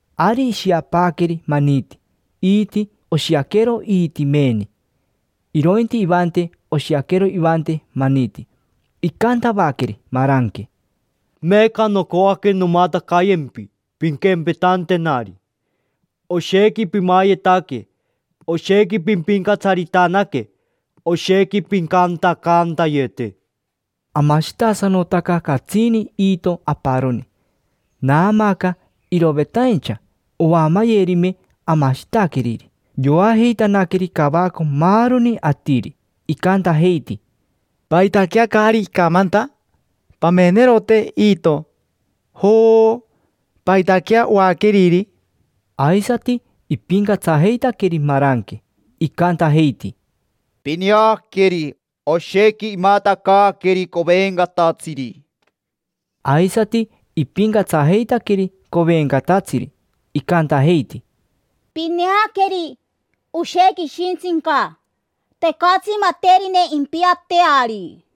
Ari ishiapaaqueri maniti. Iiti oshiaquero iiti meeni; irointi ivante oshiaquero ivante maniti. Icantavaqueri maranque: —Meeca nocoaque nomatacayempi, pinquempetantenari: oshequi pimayetaque, oshequi pimpincatsaritanaque, oshequi pincantacantayete. Amashitasanotaca catsini iito aparoni, naamaaca irovetaincha oamayerime amashitaqueriri. Yoajeitanaqueri cavaco maaroni atiri, icantajeiti: —¿Paitaquea caari icamanta? Pamenerote iito, jooo, ¿paitaquea oaqueriri? Aisati ipincatsajeitaqueri maranque, icantajeiti: —Pineaqueri, oshequi imatacaaqueri covencatatsiri. Aisati ipincatsajeitaqueri covencatatsiri, icantajeiti: —Pineaqueri, oshequi ishintsica, tecatsi materine impiateari.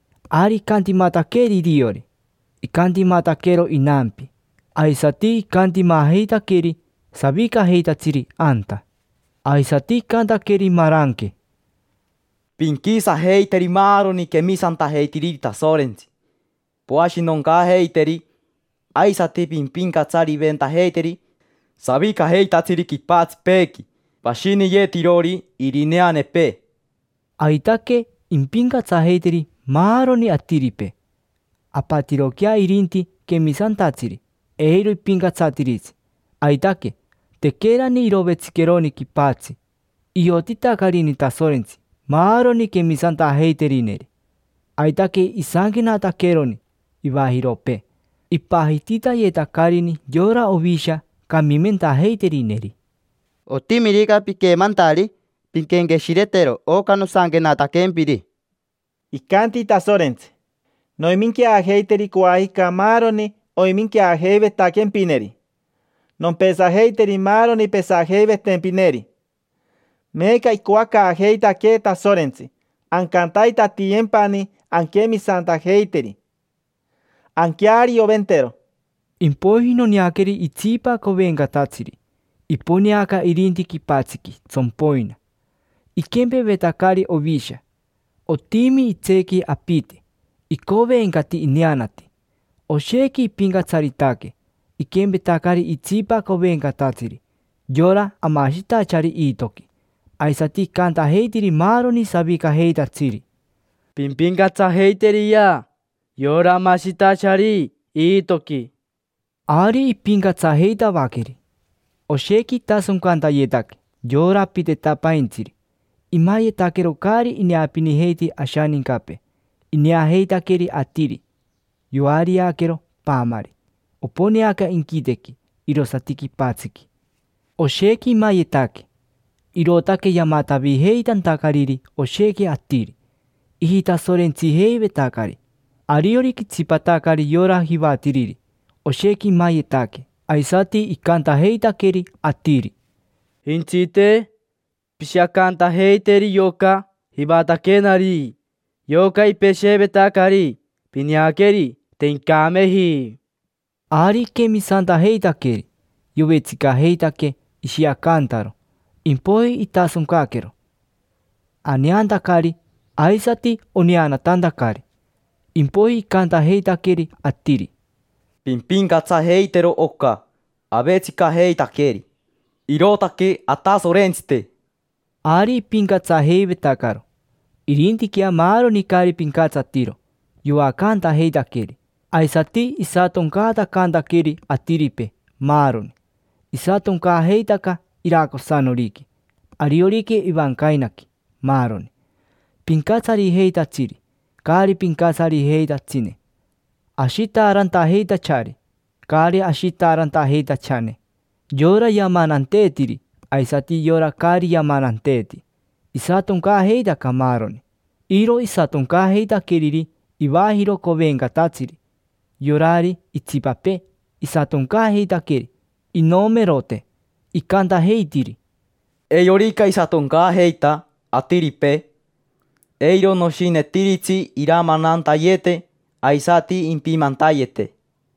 Ari icantimataqueri iriori, icantimataquero inampi, aisati icantimajeitaqueri savicajeitatsiri anta. Aisati icantaqueri maranque: —Pinquisajeiteri maaroni quemisantajeitiriri Tasorentsi, poashinoncaajeiteri. Aisati pimpincatsariventajeiteri savicajeitatsiri quipatsipeequi, pashiniyetirori irineanepee. Aitaque impincatsajeiteri maaroni atiripee. Apatiroquea irinti quemisantatsiri, eiro ipincatsatiritsi. Aitaque, tequerani irovetsiqueroni quipatsi, iotitacarini Tasorentsi maaroni quemisantajeiterineri. Aitaque isanquenataqueroni ivajiropee, ipajititayetacarini yora Ovisha camimentajeiterineri. Otimirica piquemantari, pinquenqueshiretero oca nosanquenataquempiri. Icanti Tasorentsi: “Noiminqueajeiteri coajica maaroni oiminqueajeivetaquempineri. Nompesajeiteri maaroni pesajeivetempineri”. Meeca icoacaajeitaquee Tasorentsi ancantaitatiyempani anquemisantajeiteri, anquearioventero. Impoiji noneaqueri itsipa covencatatsiri, iponeaca irinti quipatsiqui tsompoina. Iquempevetacari ovisha, otimi itseequi apite; icovencati ineanati. Oshequi ipincatsaritaque, iquempetacari itsipa covencatatsiri, yora amashitachari iitoqui. Aisati icantajeitiri maaroni savicajeitatsiri: —Pimpincatsajeiteriyea yora amashitachari iitoqui. Ari ipincatsajeitavaqueri. Oshequi itasoncantayetaque yora apitetapaintsiri. Imayetaquero caari ineapinijeiti ashanincapee. Ineajeitaqueri atiri yoariaquero paamari: oponeaca inquitequi, irosati quipatsiqui. Oshequi imayetaque, irootaque yamatavijeitantacariri oshequi atiri, ijitasorentsijeivetacari. Ariorica itsipatacari yora jivatiriri, oshequi imayetaque. Aisati icantajeitaqueri atiri: —Jentsite, pishiacantajeiteri yoca jivataquenari, yoca ipesheevetacari. Pineaqueri, te incameji. Ari iquemisantajeitaqueri, yovetsicajeitaque ishiacantaro. Impoiji itasoncaquero, aneantacari, aisati oneanatantacari. Impoiji icantajeitaqueri atiri: —Pimpincatsajeitero oca avetsicajeitaqueri: irootaque atasorentsite. Ari ipincatsajeivetacaro. Irintiquea maaroni caari pincatsatiro, yoacantajeitaqueri. Aisati isatoncaatacantaqueri atiripee, maaroni. Isatoncaajeitaca iracosanoriqui, ariorica ivancainaqui, maaroni: pincatsarijeitatsiri, caari pincatsarijeitatsine, ashitaarantajeitachari, caari ashitaarantajeitachane; yora yamananteetiri aisati yora caari yamananteeti: isatoncaajeitaca maaroni. Iro isatoncaajeitaqueriri ivajiro covencatatsiri, yorari itsipapee isatoncaajeitaqueri inomerote. Icantajeitiri: —Eirorica isatoncaajeita atiripee, eiro noshinetiritsi iramanantayete aisati impimantayete.